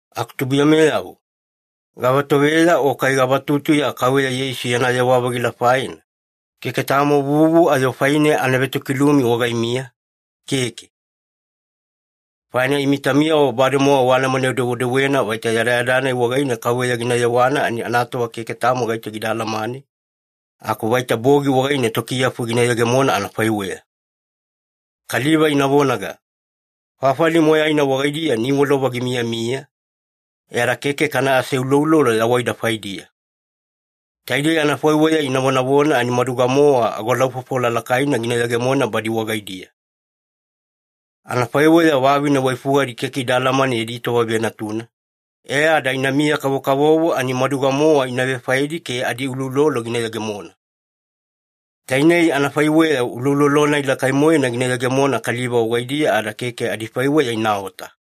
Aku tubuiyameyavo, gavatoveya o kai gavatutuya Kauveya Yeisu yana yewa-vagila faina, keke tamo vuvu ayo faine ana vetokilumi wagaimiya, keke. Faina imi taumiyavo bademowa waalamane-dewedewena vaita yadayada-nai wagaine Kauveya gina yewana ani anatova keke tamo gaito gida alamane, aku vaita bogi wagaine tokiyafu gina yegemona anafaiweya. Kaliva ina vonaga, “Fafali moyaina wagaidiya niwalova gimiyamiya, e ada keke kana aseuloulolo yawaida faidiya.” Taidei anafaiweya ina vonavona ani maduga-mowa agolaufofola lakaina gina yegemona badi wagaidiya. Anafaiweya vavine waifugadi keke ida alamane yadi tova venatuna, e ada inamiya-kavokavovo ani maduga-mowa ina vefaedi ke adiuloulolo gina yegemona. Tainei anafaiweya uloulolo-nai lakai-moena gina yegemona kaliva wagaidiya, ada keke adifaiweya inaota.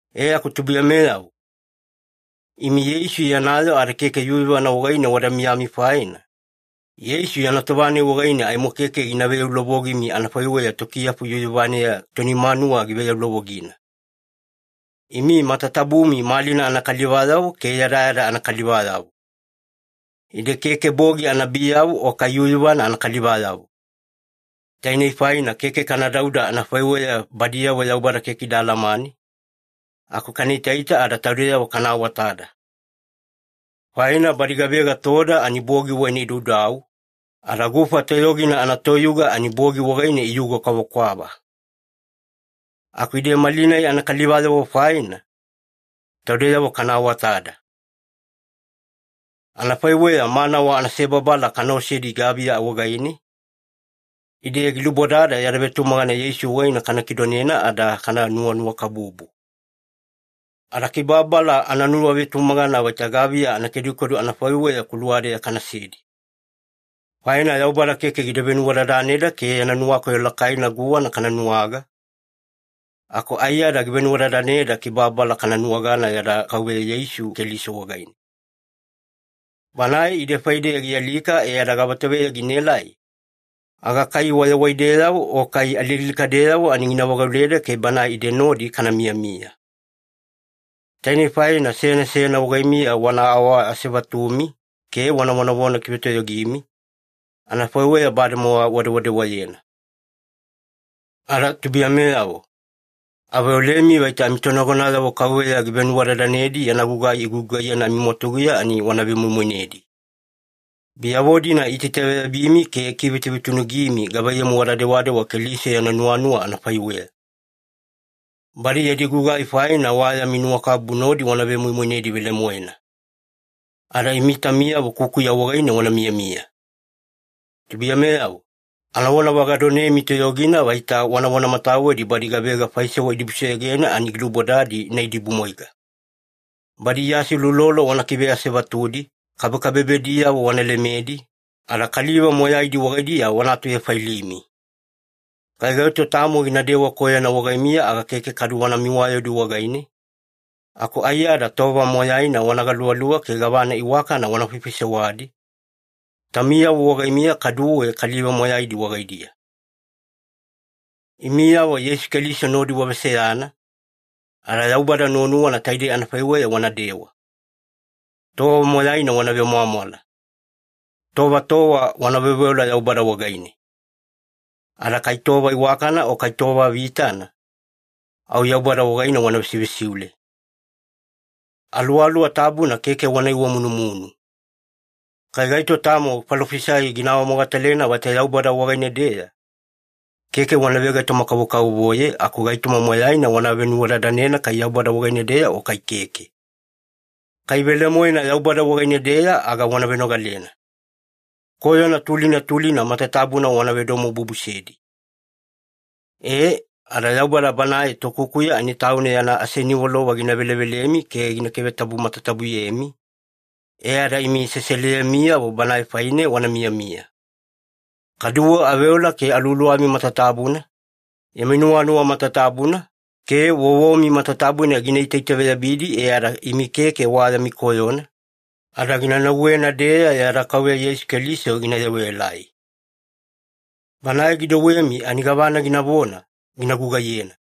E aku tubuiyameyavo, imi Yeisu yana yoo ada keke yuyuvana wagaine wada miyami faina, Yeisu yana tova-nai wagaine aimo keke gina veyaulovogimi anafaiweya tokiyafu yuyuvaneya toni manuwa giveyaulovogina. Imi matatabumi malina anakalivayavo ke yadayada anakalivayavo. Ide keke bogi anabiyavo o kai yuyuvana anakalivayavo. Tainei faina keke kana dauda anafaiweya badiyavo Yaubada keke ida alamane, aku kana itaita ada taudeyavo kana awatada. Faina badi gavega toda ani bogi wagaine idaudau, ada gufa toyogina anatoyuga ani bogi wagaine iyuga kwavakwava. Aku ide malina anakalivayavo faina, taudeyavo kana awatada. Anafaiweya manawa anasebabala kana osedi gaviya wagaine, ide gilubodada yada vetumagana Yeisu wagaine kana kidonena ada kana nuwanuwakabubu. Ada kibababala ananuwavetumagana vaita gaviya anakedukedu anafaiweya kuluwa-deya kanasedi. Faina Yaubada keke gida venuwadadaneda ke yana nuwakoyo lakaina guwana kana nuwaga, aku aiyada givenuwadadaneda kibababala kana nuwagana yada Kauveya Yeisu Keliso wagaine. Banae ide faideya gialika e ada gavatoveya ginaelai, aga kai wayawaideyavo o kai alialikadeyavo ani gina vagauleda ke Banae ide nodi kana miyamiya. Tainei faina seyana seyana wagaimiya wana awaasevatumi ke wana vonavona kivetoyogimi, anafaiweya bademowa wadewadewayena. Ada tubuiyameyavo, aveolemi vaita amitonagonayavo Kauveya givenuwadadanedi yana gugai igugugaiyena amimwatuguya ani wana vemoimoinedi. Biyavo-dina iitaitaveyabimi ke ikivetuvetunugimi gavaiyamu wada dewadewa Keliso yana nuwanuwa anafaiweya. Badi yadi gugai faina wa yami nuwakabubu nodi wana vemoimoinedi velemoena. Ada imi taumiyavo kukuya wagaine wana miyamiya. Tubuiyameyavo, anavona vagadonemi toyogina vaita wana vonamatawedi badi gavega faisewa idibusoyogena ani gilubodadi ina idibumwaiga. Badi iaseuloulolo wana kiveasevatudi, kabekabebediyavo wana lemedi, ada kaliva moyaidi wagaidiya wana atuvefailimi. Kai gaito tamo ginadewa koyona wagaimiya aga keke kadu wana miwayaudi wagaine, aku aiyada tova moyaina wana galuvaluva ke gavana iwakana wana faifaisewadi, taumiyavo wagaimiya kaduwe kaliva moyaidi wagaidiya. Imiyavo Yeisu Keliso nodi waveseyana, ada Yaubada nuwanuwana taidei anafaiweya wanadewa. Tova moyaina wana vemwamwala. Tova tova wana veoveola Yaubada wagaine. Ada kai tova iwakana o kai tova vitana, au Yaubada wagaine wana vesivesiule. Aluwaluwa Tabuna keke wana iwamunumunu. Kai gaito tamo falofisai gina awamogatalena vaita Yaubada wagaine-deya, keke wana vegaitoma-kavokavovoye aku gaitoma moyaina wana venuwadadanena kai Yaubada wagaine-deya o kai keke. Kai velemoena Yaubada wagaine-deya aga wana venogalena. Koyona tulina tulina matatabuna wana vedomobubusedi. Ee, ada Yaubada Banae Tokukuya ani Tauna yana aseniwalova gina velevelemi ke gina kivetabu matatabuyemi, e ada imi seseliyemiyavo Banae faine wana miyamiya. Kaduwe aveola ke aluwaluwami matatabuna, yami nuwanuwa matatabuna, ke vovomi matatabuna gina itaitaveyabidi e ada imi keke wa yami koyona, ada gina nauwena-deya yada Kauveya Yeisu Keliso gina yewaelai. Banae gidouwemi ani gavana ginavona, gina gugaiyena.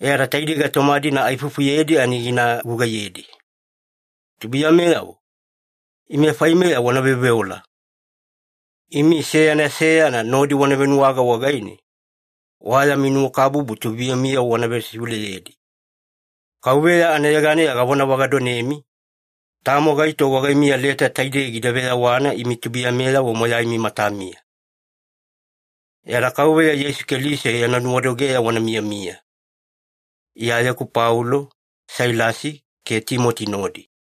E ada taidei gaitoma-dina aifufuyedi ani gina gugaiyedi. Tubuiyameyavo, ime faimeya wana veoveola. Imi seyana seyana nodi wana venuwaga wagaine, wa yami nuwakabubu tubuiyamiyavo wana vesiuleyedi. Kauveya anayeganeya gavonavagadonemi, tamo gaito wagaimiya leta taidei gida veyawana imi tubuiyameyavo moyaimi matamiya. Yada Kauveya Yeisu Keliso yana nuwadogeya wana miyamiya. Iyayeku Paulo, Sailasi, ke Timoti nodi